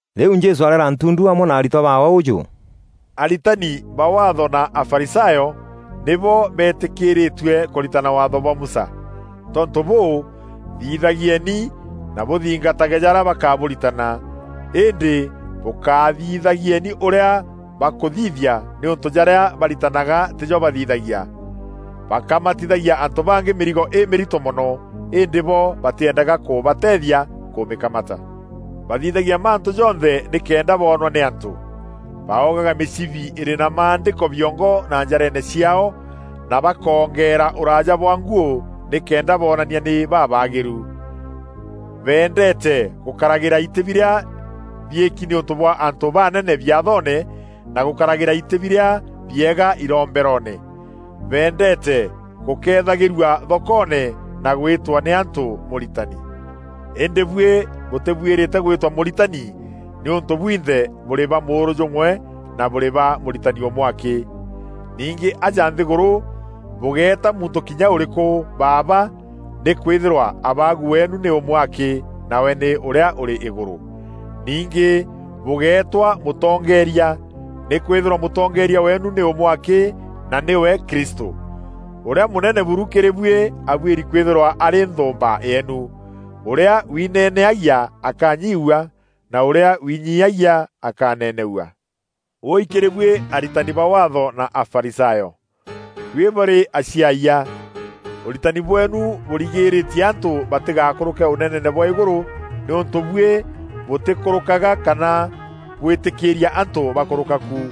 Rîu Jesû areera ntundu amwe na aritwa baawe ûjû, “Aritani ba Waatho na Afarisayo nîbo beetîkîrîtue kûritana Waatho bwa Musa. Tontû bûû, thithagieni na bûthingatage jarîa bakabûritana, îndî bûkáthithagieni ûrîa bakûthithia nîûntû jarîa baritanaga tîjo bathithagia. Bakamatithagia antû bangî mîrigo îmîrito mono, îndî bo batîendaga kûbateethia kûmîkamata. Bathithagia mantû jonthe nîkenda boonwa nî antû. Baogaga mîcibi îrî na Maandîko biongo na njareene ciaao, na bakoongeera ûraaja bwa nguû, nîkenda bonania nî babaagîru. Beendeete gûkaragîra itî birîa biîki nîûntû bwa antû baanene biathoone na gûkaragîra itî birîa biega iromberoone. Beendeete gûkethagîrua thokoone na gwîtwa nî antû: ‘Mûritani.’ Îndî buî bûtîbuîrîte gwîtwa ‘Mûritani’ nîûntû bwinthe bûrî ba mûûrû jûmwe na bûrî na Mûritani ûmwe akî. Ningî aja nthîgûrû bûgéeta muntû kinya ûrîkû ‘Baaba,’ nîkwîthîrwa Abaagu weenu nî ûmwe akî, nawe nî ûrîa ûrî îgûrû. Ningî bûgéetwa ‘Mûtongeeria,’ nîkwîthîrwa mûtongeeria weenu nî ûmwe akî, na nîwe Kristû. Ûrîa mûnene buru kîrî buî abuîri kwîthîrwa arî nthûûmba yeenu. Ûrîa wineneagia akanyiiua, na ûrîa winyiiagia akaneneua. “Wûûi kîrî buî aritani ba Waatho na Afarisayo; buî bûrî aciayia! Ûritani bweenu bûrigîrîtie antû batîgakûrûke Ûneneene bwa îgûrû nîûntû bûi bûtîkûrûkaga kana bwîtîkîîria antû bakûrûka ku. [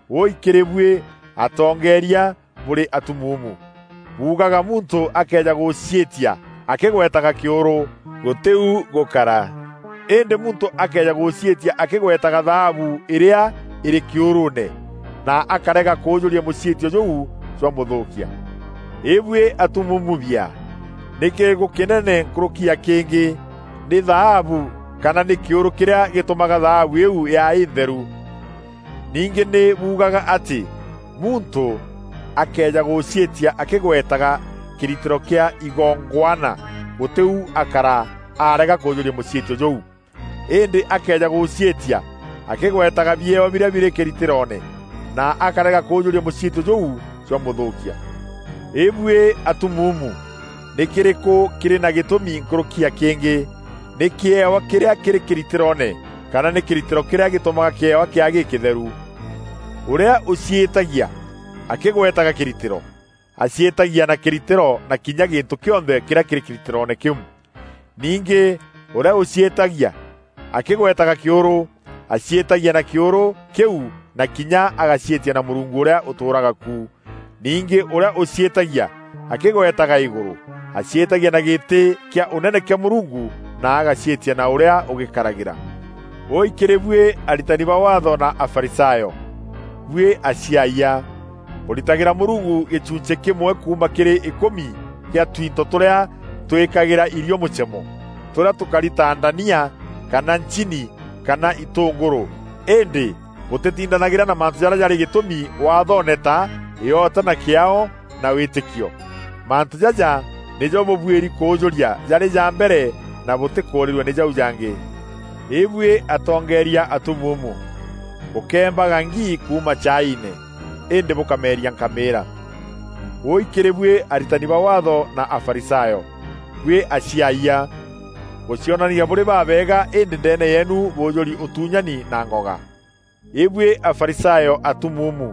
Wûûi kîrî buî atongeeria bûrî atumuumu! Buugaga muntû akëeja gûciîtia akîgwetaga kîûrû, gûtî u gûkara. Îndî muntû akëeja gûciîtia akîgwetaga thaabu îrîa îrî kîûrûûne, na akarega kûûjûria mûciîtio jûu, jwamûthûûkia. Îbuî atumuumu biaa! Nî kîrîkû kînene nkûrûki ya kîngî: nî thaabu kana nî kîûrû kîrîa gîtûmaga thaabu îîu yaa întheru? Ningî nî buugaga atî muntû akëeja gûciîtia akîgwetaga kîritîro kîa igongwana, gûtî u akara arega kûûjûria mûciîtio jûu. Îndî akëeja gûciîtia akîgwetaga biewa birîa birî kîritîroone, na akarega kûûjûria mûciîtio jûu, jwamûthûûkia. Îbuî atumuumu! Nî kîrîkû kîrî na gîtûmi nkûrûki ya kîngî: nî kîewa kîrîa kîrî kîritîroone kana nî kîritîro kîrîa gîtûmaga kîewa kîaa gîkîtheru? Ûrîa ûciîtagia akîgwetaga kîritîro, aciîtagia na kîritîro na kinya gîntû kîonthe kîrîa kîrî kîritîroone kîu. Ningî ûrîa ûciîtagia akîgwetaga kîûrû, aciîtagia na kîûrû kîu na kinya agaciîtia na Mûrungu ûrîa ûtûûraga ku. Ningî ûrîa ûciîtagia akîgwetaga îgûrû, aciîtagia na gîtî kîa Ûnene kîa Mûrungu na agaciîtia na ûrîa ûgîkaragîra. Wûûi kîrî buî aritani ba Waatho na Afarisayo, buî aciayia! Bûritagîra Mûrungu gîchunchî kîmwe kuuma kîrî îkûmi kîa twinto tûrîa twîkagîra irio mûchemo, tûrîa tûkari ta ndania kana nchini kana itûngûrû îndî bûtîtindanagîra na mantû jarîa jarî gîtûmi waathoone ta: îota na kîaao na wîtîkio. Mantû jaja nîjo bûbuîri kûûjûria jarî ja mbere na bûtîkûûrîrua nî jau jangî. Îbuî atongeeria atumuumu! Bûkembaga ngi kuuma chaiine, îndî bûkameria nkamîîra. “Wûûi kîrî buî aritani ba Waatho na Afarisayo, buî aciayia! Bûcionanagia bûrî babeega îndî ndeene yeenu bûûjûri ûtuunyani na ngoga. Îbuî Afarisayo atumuumu,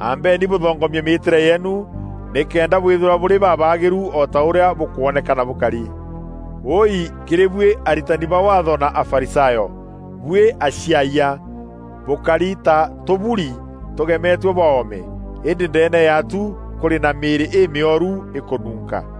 ambeni bûthongomie mîîtîre yeenu, nîkenda bwîthîrwa bûrî babaagîru o ta ûrîa bûkwonekana bûkari. Wûûi kîrî buî aritani ba Waatho na Afarisayo, buî aciaayia! Bûkari ta tûburi tûgemetue bwa oome, îndî ndeene ya tu kûrî na mîîrî îmîoru îkûnuunka.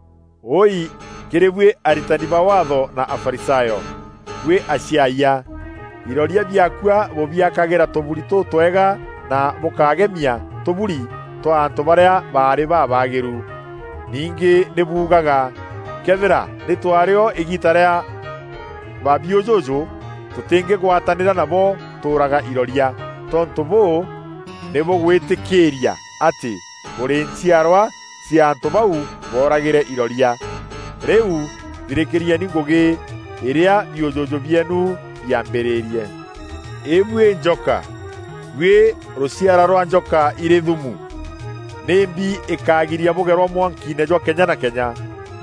“Wûûi kîrî buî aritani ba Waatho na Afarisayo, buî aciaayia! Iroria biakua bûbiakagîra tûburi tûtwega na bûkagemia tûburi twa antû barîa baarî babaagîru. Ningî nî buugaga, ‘Këethîra nî twaarî o îgiita rîa ba biûjûjû, tûtîngîgwatanîra nabo tûûraga iroria.’ Tontû bûû, nî bûgwîtîkîîria atî bûrî nchiarwa cia antû bau booragîre iroria. Rîu thirîkîrieni ngûgî îrîa biûjûjû bieenu biaambîrîrie! Îbuî njoka, buî rûciara rwa njoka irî thumu! Nîmbi îkagiria bûgerwa mwankiine jwa kenya na kenya?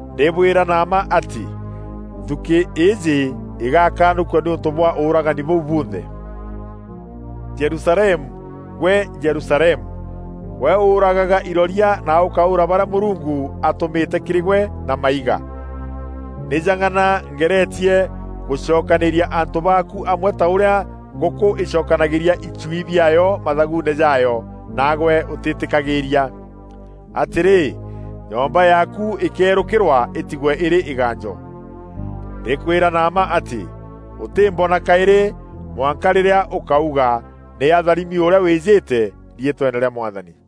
Ndîbwîra na mma atî, nthûkî îîjî îgakanûkua nîûntû bwa ûûragani bûu bunthe. “Jerusalemu, gwe Jerusalemu! Gwe ûûragaga iroria na ûkaûûra barîa Mûrungu aatûmîte kîrî gwe na maiga! Nî jang'ana ngeretie gûcokanîîria antû baaku amwe ta ûrîa ngûkû îcokanagîîria ichui biaayo mathaguune jaayo, naagwe ûtîîtîkagîîria. Atîrî, nyomba yaaku îkeerûkîrwa îtigwe îrî îgaanjo. Ndîkwîra na mma atî, ûtîmbona kaîrî, mwanka rîrîa ûkauga: ‘Nî atharimi ûrîa wîjîte riîtweene rîa Mwathani.’”